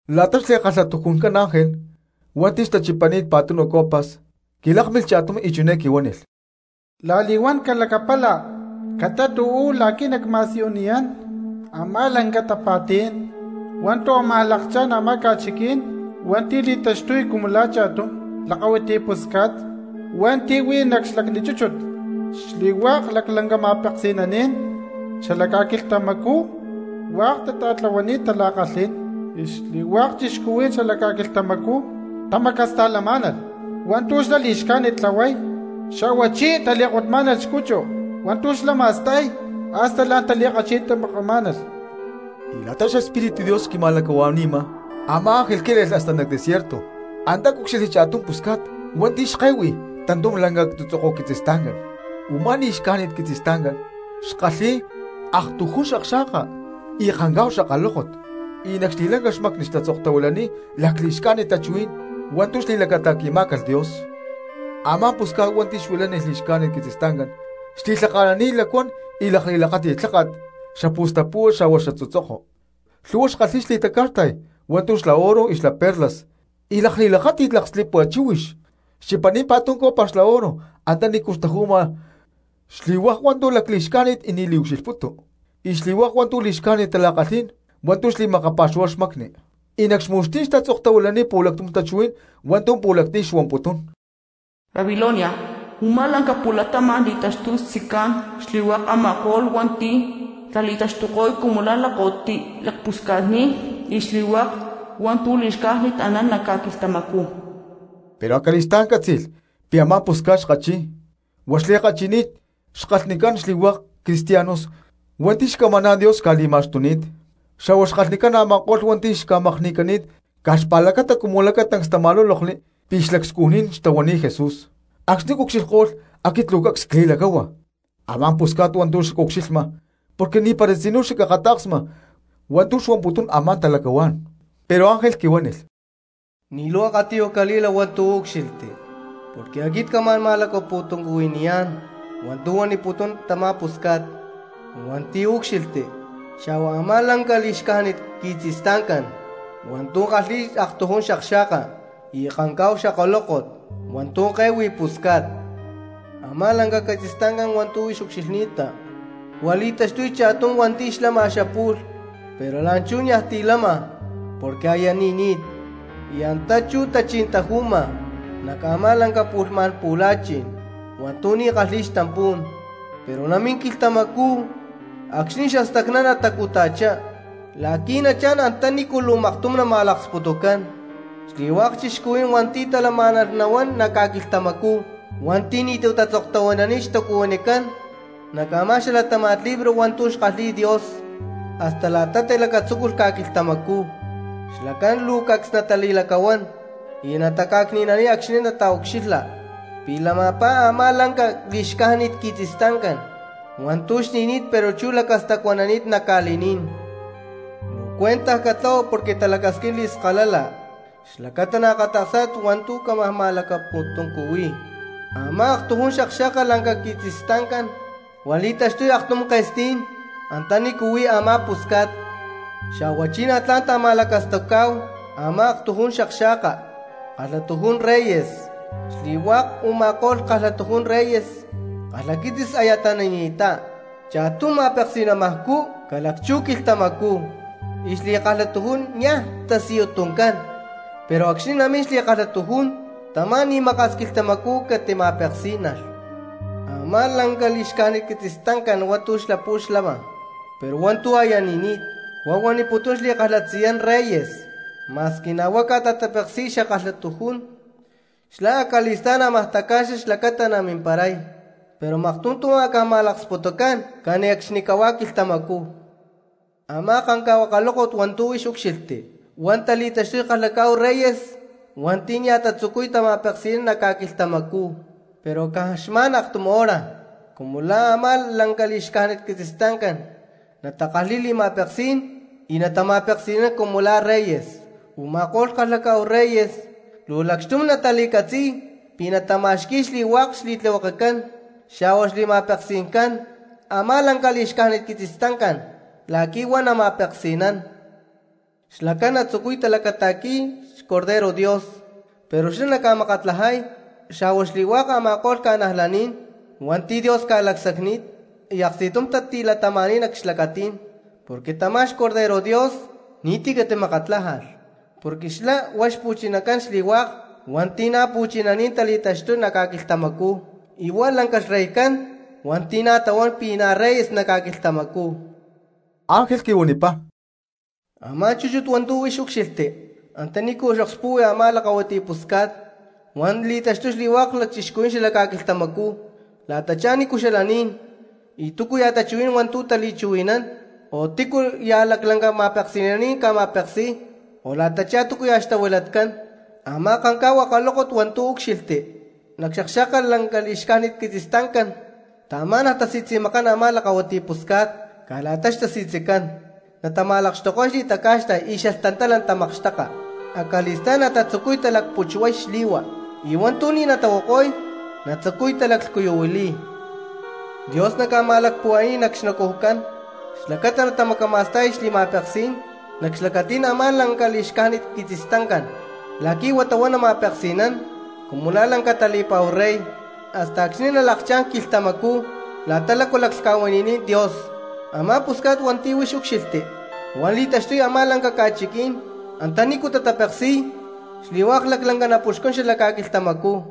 La̠ta xli̠kalhatujuncán ángel hua̠nti̠ xtachipani̠t pa̠tunu copas, quilákmilh cha̠tum y chiné quihuánilh: —La̠li̠huán calacapala catát uú la̠qui̠ nacma̠siyuniyá̠n a̠má lanca tapa̠tí̠n hua̠ntu̠ ámaj lakchá̠n a̠má ca̠chiquí̠n hua̠nti̠ li̠taxtuy cumu la̠ cha̠tum lakahuiti pusca̠t hua̠nti̠ huí nac xlacni chúchut. Xli̠hua̠k laclanca ma̠peksi̠naní̠n xalac ca̠quilhtamacú hua̠k tata̠tlahuani̠t tala̠kalhí̠n y xli̠hua̠k cristianos xalac ca̠quilhtamacú tamacasta̠lamá̠nalh hua̠ntu̠ xlá li̠xcájnit tlahuay, xa̠huachí tali̠kotmá̠nalh xcuchu hua̠ntu̠ xlá ma̠sta̠y hasta la̠n tali̠kachi̠tamakamá̠nalh. Y la̠ta xEspíritu Dios xquima̠lacahua̠ni̠ma, a̠má ángel quíle̠lh hasta nac desierto, antá cúcxilhli cha̠tum pusca̠t hua̠nti̠ xke̠hui tantum lanca tzutzoko quitzistancá, u̠má li̠xcájnit quitzistancá xkalhi̠y aktujún xakxa̠ka y kancá̠hu xakalókot, y nac xli̠lanca xmacni xtatzoktahuilani̠t lacli̠xcájnit tachuhuí̠n hua̠ntu̠ xli̠lacata̠qui̠má̠calh Dios. Amá pusca̠t hua̠nti̠ xuilánilh li̠xcájnit quitzistancán xli̠lhaka̠nani̠t lacuán y lakli̠lakáti̠t lháka̠t xapu̠stapu̠hua xa̠hua xatzutzoko, lhu̠hua xkalhi̠y xli̠taca̠xta̠y hua̠ntu̠ xla oro, xla perlas y lakli̠lakáti̠t lakslipua chíhuix. Xchipani̠t pa̠tum copa xla oro antanícu xtaju̠ma xli̠hua̠k hua̠ntu̠ lacli̠xcájnit y ni̠ liucxilhputu, y xli̠hua̠k hua̠ntu̠ li̠xcájnit tala̠kalhí̠n hua̠ntu̠ li̠makapa̠xuhuay xmacni. Y nac xmu̠xtí̠n xtatzoktahuilani̠t pu̠lactum tachuhuí̠n hua̠ntu̠ pu̠lactiyu̠ xuamputún: “Babilonia, u̠má lanca pu̠latama̠n li̠taxtuy xtzicán xli̠hua̠k a̠ma̠ko̠lh hua̠nti̠ tali̠taxtuy cumu la̠ lakahuiti lacpusca̠tní̠n, y xli̠hua̠k hua̠ntu̠ li̠xcájnit anán nac ca̠quilhtamacú.” Pero acali̠stá̠n ccátzi̠lh pi̠ a̠má pusca̠t xkachi̠y, huá xli̠kachi̠ni̠t xkalhnicán xli̠hua̠k cristianos hua̠nti̠ xcamaná̠n Dios xca̠li̠ma̠xtuni̠t, xa̠hua xkalhnicán a̠ma̠ko̠lh hua̠nti̠ xca̠makni̠cani̠t caj xpa̠lacata cumu lacatancs tama̠lúlokli pi̠ xlacscujní̠n xtahuani̠t Jesús. Acxni̠ cucxilhko̠lh aquit luu cacs cli̠lacáhua a̠má pusca̠t hua̠ntu̠ xacucxilhma porque ni̠para tzinú xacakata̠ksma hua̠ntu̠ xuaniputún a̠má talacahuá̠n. Pero ángel quihuánilh: —Ni̠ luu akatiyuj cali̠la hua̠ntu̠ úcxilhti, porque aquit camá̠n ma̠lacapu̠tuncuhui̠niyá̠n hua̠ntu̠ huaniputún tamá pusca̠t hua̠nti̠ úcxilhti xa̠hua a̠má lanca li̠xcájnit quitzistancá hua̠ntu̠ kalhi̠y aktujún xakxa̠ka y kancá̠hu xakalókot hua̠ntu̠ ke̠hui pusca̠t. Amá lanca quitzistancá hua̠ntu̠ huix ucxilhni̠ta, huá li̠taxtuy cha̠tum hua̠nti̠ xlama xapu̠lh pero la̠nchú niaj ti̠ lama porque aya ni̠ni̠t y antá chú tachí̠n taju̠ma nac a̠má pu̠lhmá̠n pu̠la̠chi̠n hua̠ntu̠ ni̠ kalhi̠y xtampú̠n, pero namín quilhtamacú acxni̠ xastacná natacuta̠chá la̠qui̠ nachá̠n antanícu luu maktum nama̠laksputucán. Xli̠hua̠k cristianos hua̠nti̠ talamá̠nalh nahuán nac ca̠quilhtamacú hua̠nti̠ ni̠tu̠ tatzoktahuilani̠t xtacuhuinicán nac a̠má xalatáma̠t libro hua̠ntu̠ xkalhi̠y Dios hasta la̠ta tilacatzúculh ca̠quilhtamacú, xlacán luu cacs natali̠lacahuán y nataca̠cni̠nani̠y acxni̠ nataucxilha pi̠ lama̠pajá a̠má lanca li̠xca̠jnit quitzistancán hua̠ntu̠ xni̠ni̠t pero chú lacastacuanani̠t nac ca̠li̠ní̠n. ’Luu cuentaj catlahua porque talacasquín li̠skalala xlacata naakata̠ksá̠tit hua̠ntu̠ cámaj ma̠lacapu̠tuncuhui̠y: Amá aktujún xakxa̠ka lanca quitzistancán, huá li̠taxtuy aktujún ke̠sti̠ní̠n antanícu huí a̠má pusca̠t; xa̠huachí na̠ tla̠n ta̠ma̠lacastucá̠hu a̠má aktujún akxa̠ka, kalhatujún reyes. Xli̠hua̠k u̠ma̠ko̠lh kalhatujún reyes, kalhaquitzis aya tani̠ni̠ttá, cha̠tum ma̠peksi̠namajcú ca̠lacchú quilhtamacú, y xli̠kalhatujún nia̠ tasiyuy tuncán. Pero acxni̠ namín xli̠kalhatujún tamá ni̠ maka̠s quilhtamacú catima̠peksí̠nalh. Amá lanca li̠xcájnit quitzistancán hua̠ntu̠ xapu̠lh xlama pero hua̠ntu̠ aya ni̠ni̠t, huá huaniputún xli̠kalhatzayán reyes, ma̠squi na̠ huá ca̠ta̠tapeksi̠y xa̠kalhatujún, xlá acali̠stá̠n ámaj taca̠xa xlacata namimparay, pero maktum tu̠ amá̠calh ma̠laksputucán cani̠cxnicahuá quilhtamacú. ’Amá kancá̠hu akalókot hua̠ntu̠ huix úcxilhti, huá tali̠taxtuy kalhacá̠hu reyes hua̠nti̠ nia̠ tatzucuy tama̠peksi̠nán nac ca̠quilhtamacú; pero caj xma̠n aktum hora cumu la̠ a̠má lanca li̠xcájnit quitzistancán natakalhi̠y li̠ma̠peksí̠n y natama̠peksi̠nán cumu la̠ reyes. Uma̠kó̠lh kalhaká̠hu reyes luu lacxtum tali̠catzi̠y pi̠ natama̠xqui̠y xli̠hua̠k xli̠tlihuekecán xa̠hua xli̠ma̠peksi̠ncán a̠má lanca li̠xcájnit quitzistancán la̠qui̠ huata huá nama̠peksi̠nán. Xlacán natatzucuy talacata̠qui̠y a̠má hua̠nti̠ li̠taxtuy xBorrego Dios; pero xlá naca̠makatlajay xa̠hua xli̠hua̠k a̠ma̠ko̠lh cristianos hua̠nti̠ Dios ca̠lacsacni̠t y aksti̠tum tatilatama̠ni̠t nac xlacatí̠n, porque tamá xBorrego Dios ni̠ti̠ catimakatlájalh, porque xlá huá xpu̠chinacán xli̠hua̠k hua̠nti̠ na̠ pu̠chinaní̠n tali̠taxtuy nac ca̠quilhtamacú, y huá lanca xreycán hua̠nti̠ na̠ tahuán pi̠ reyes nac ca̠quilhtamacú. Angel quihuanipá: —Amá chúchut hua̠ntu̠ huix úcxilhti antanícu okspu̠hui a̠má lakahuiti pusca̠t, huá li̠taxtuy xli̠hua̠k cristianos xala ca̠quilhtamacú la̠tachá nícu xalaní̠n y túcuya̠ tachuhuí̠n hua̠ntu̠ tali̠chuhui̠nán, o tícuya̠ laclanca ma̠peksi̠naní̠n ca̠ma̠peksi̠y, o la̠tachá túcuya̠ xtahuilatcán. Amá kanká̠hu akalókot hua̠ntu̠ úcxilhti nac xakxa̠ka li̠xcájnit quitzistancán taamá̠nalh tasi̠tzi̠makán a̠má lakahuiti pusca̠t caj la̠ta xtasi̠tzicán, natama̠lakxtuko̠y xli̠taca̠xta̠y y xalhtantala natamakxteka, acali̠stá̠n natatzucuy talacputxhuay xli̠hua, y hua̠ntu̠ ni̠ natahuako̠y natatzucuy talaclhcuyuhuili̠y. Dios naca̠ma̠lacpuhua̠ni̠y nac xnacujcán xlacata natamacama̠sta̠y xli̠ma̠peksí̠n nac xlacatí̠n a̠má lanca li̠xcájnit quitzistancán la̠qui̠ huata huá nama̠peksi̠nán cumu la̠ lanca tali̠pa̠hu rey hasta acxni̠ nalakchá̠n quilhtamacú la̠ta lácu laclhca̠huili̠ni̠t Dios. Amá pusca̠t hua̠nti̠ huix úcxilhti, huá li̠taxtuy a̠má lanca ca̠chiquí̠n antanícu tatapeksi̠y xli̠hua̠k laclanca napuxcún xalac ca̠quilhtamacú.